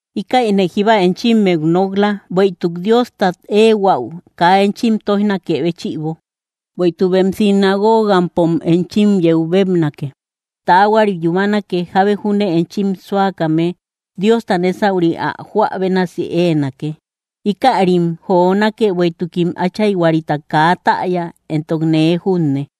’Íkäine jíba enchimmeu nok‑la, bueïtuk Diostat éehuäu kaa enchim tóijnakë béchïbo. Bueïtuk bem sinagogampom enchim yeu bébnake. Taahuari yúmanake, jábe júne enchim súakame Diosta nésauri áu joä bénasi éenake. Íkärim jonake bueïtukim Áchayhuarita kaa täya éntok nee junne.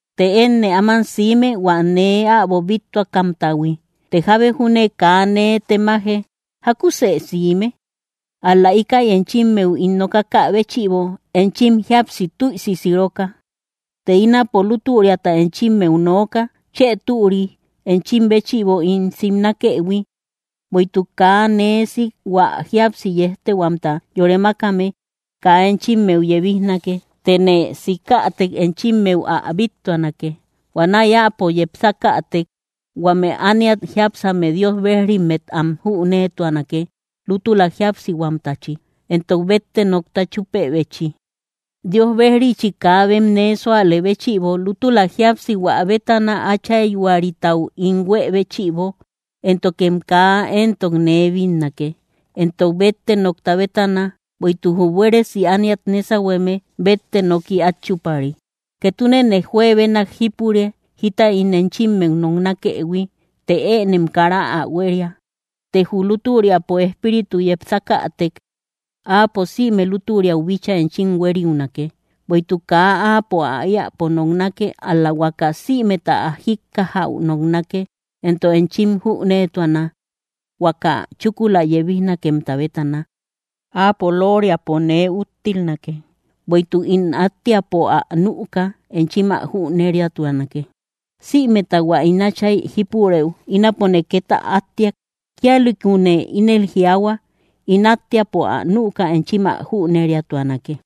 Të énne áman siime, hua nee äbo bíttuakamtahui; të jábe júne kaa nee temaje: “¿Jákusë siime?” Ál‑la íkäi enchimmeu ín nokakä béchïbo enchim jíapsi tüisi siroka. Të ínapo lútüriata enchimmeu nooka: Chë türi enchim béchïbo ín simnakëhui; bueïtuk kaa nee sik hua jíapsi yéjtehuamta yore mákame kaa enchimmeu yebijnake; tëne sikätek enchimmeu ä bíttuanake. Huanäi áapo yepsakätek, huame ániat jiápsame Dios bejrimmet am jüneetuanake, lútula jíapsihuamtachi, éntok bétte nokta chúpebechi. Dios bejrichi, kaa bem nee súalë béchïbo; lútula jíapsihua bétana, Áchayhuaritau ín huée béchïbo, éntokem kaa entok nee bínnake; éntok bétte nokta bétana, bueïtuk jü buéresi ániat nésahueme bétte noki át chúpari. ’Ketunene juebenak jípure, jita ín enchimmeu noknakëhui, të ënem kara ä huéria. Të jü lútüriapo Espíritu yepsakätek, áapo sïme lútüriau bíchaa enchim hueriunake; bueïtuk kaa áapo ä éäpo noknake, ál‑la huaka sïmeta ä jíkkajäu noknake; éntok enchim jünetuana huaka chúkula yebijnakemta bétana. Áapo loriapo nee úttilnake; bueïtuk ín átteapo ä nüka, enchim ä jüneriatuanake. Sïmeta hua ín Áchay jípurëu, ínapone két ä átteak; kíalïkune ínel jiaahua, ín átteapo ä nüka enchim ä jüneriatuanake.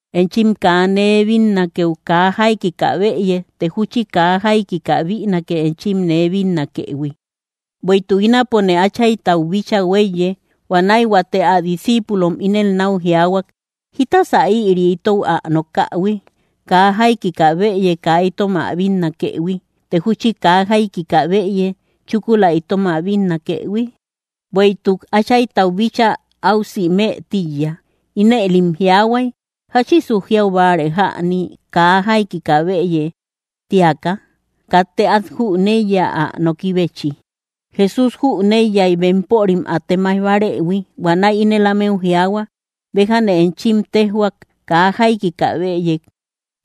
’Enchim kaa nee bínnakeu, kaa jaikika bëye; të júchi kaa jaikika bïnake, enchim nee bínnakëhui; bueïtuk ínapone Áchaytau bíchaa huéiye. Huanäi huate ä discíipulom ínel náu jiaahuay: —¿Jítasa ïri itou ä nokähui? Kaa jaikika bëye kaa itom ä bínnakëhui, të júchi kaa jaikika bëye, chúkula itom ä bínnakëhui; ¡bueïtuk Áchaytau bíchaa áu simë tíiya! Inëlim jiaahuay: ¿Jáchisu jiau báare jäni, “kaa jaikika bëye”, tíaka? Katte át jüneiya, ä nokibechi. Jesús jüneiyay bempörim ä temaij bárëhui; huanäi ínel ámeu jiaahua: —Béjane enchim téjhuak: kaa jaikika bëye,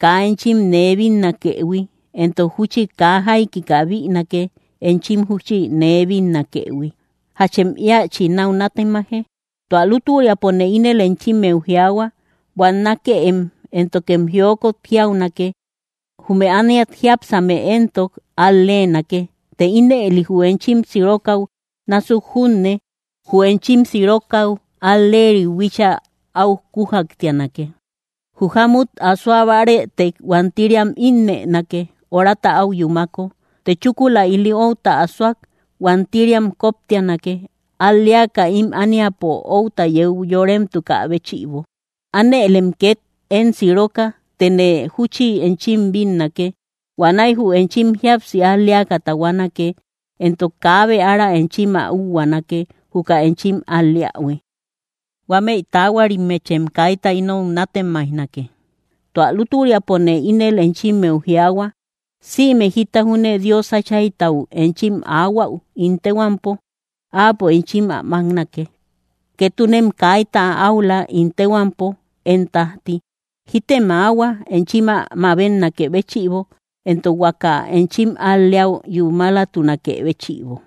kaa enchim nee bínnakëhui, éntok júchi kaa jaikika bïnake, enchim júchi nee bínnakëhui. ¿Jachem íachi náu nátemaje? Tua lútüriapone ínel enchimmeu jiaahua: buannakeem, éntokem jiokot jiaunake; jume ániat jiápsame éntok al-leenake. Të ínëli jü enchim sirokäu násuk junne, jü enchim sirokäu al‑leeriu bíchaa áu kúaktianake. Jü jámut asoa bárëtek huantiriam ínnënake, horata áu yúmako; të chúkula ili outa asoak huantiriam koptianake, al‑leaka ím ániapo outa yeu yoremtukä béchïbo. Ánëlem két én siroka; tëne júchi enchim bínnake. Huanäi jü enchim jíapsi al‑leaka tahuanake, éntok kaabe ára enchim ä úhuaanake, juka enchim al‑leähui. ’Huámeï taahuarimmechem kaita inou nátemaijnake. Tua lútüriapone ínel enchimmeu jiaahua, sïme jita júne Dios Áchaytau enchim aahuäu ín téhuampo, Áapo enchim ä máknake. Ketunem kaita áula ín téhuampo, én tájti. Jítem aahua, enchim ä mabetnakë béchïbo, éntok huaka enchim al‑leäu yúmalatunakë béchïbo.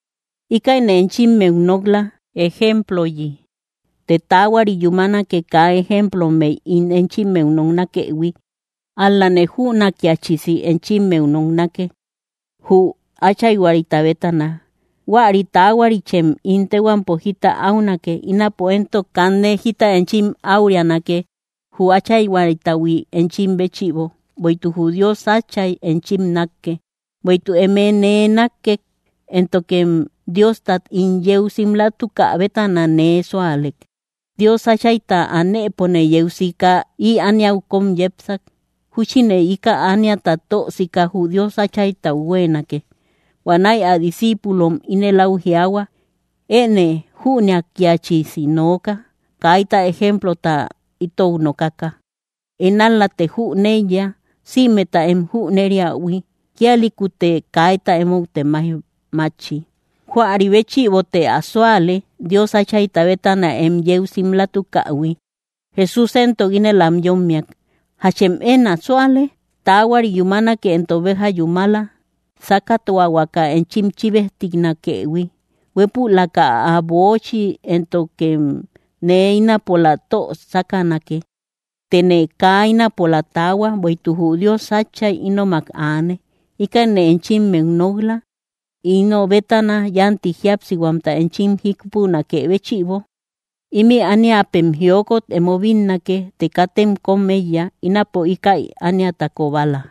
’Íkäine enchimmeu nok‑la, ejemployi; të taahuari yúmanake, kaa ejemplommey ín enchimmeu noknakëhui; ál‑lane jünakiachisi enchimmeu noknake, jü Áchayhuarita bétana. Huäri taahuarichem ín téhuampo jita áunake; ínapo éntok kanne jita enchim áurianake, jü Áchayhuaritahui enchim béchïbo, bueïtuk jü Dios Átchay enchim nákke, bueïtuk eme nee nákkek, éntokem Diostat ín yeu simlatukä bétana nee súalek. Dios Áchayta anëpone yeu sika, ï ániau kóm yepsak. Júchine íka ániata tö sika, jü Dios Áchaytau huéenake. Huanäi ä discíipulom ínel áu jiaahua: —Enë jünakiachisi nooka, kaita ejemplota itou nokaka. Én ál‑late jüneiya, sïmeta em jüneriähui; kíalïkute kaita emou temaij mátchi. Huäri béchïbote ä súale, Dios Áchayta bétana em yeu simlatukähui. Jesús éntok ínel am yómmiak: —¿Jachem én ä súale? Taahuari yúmanake, éntok béja yúmala, sákatuahuaka enchim chíbejtinakëhui, huépülaka ä böochi; éntokem nee ínapola tö sákanake. Tëne kaa ínapola taahua, bueïtuk jü Dios Áchay ínomak aane. Íkäine enchimmeu nok‑la, ino bétana yánti jíapsihuamta enchim jípunakë béchïbo. Ímï ániapem jiokot emo bínnake; të katem kóm éiya: ínapone íkäi ániata kobala.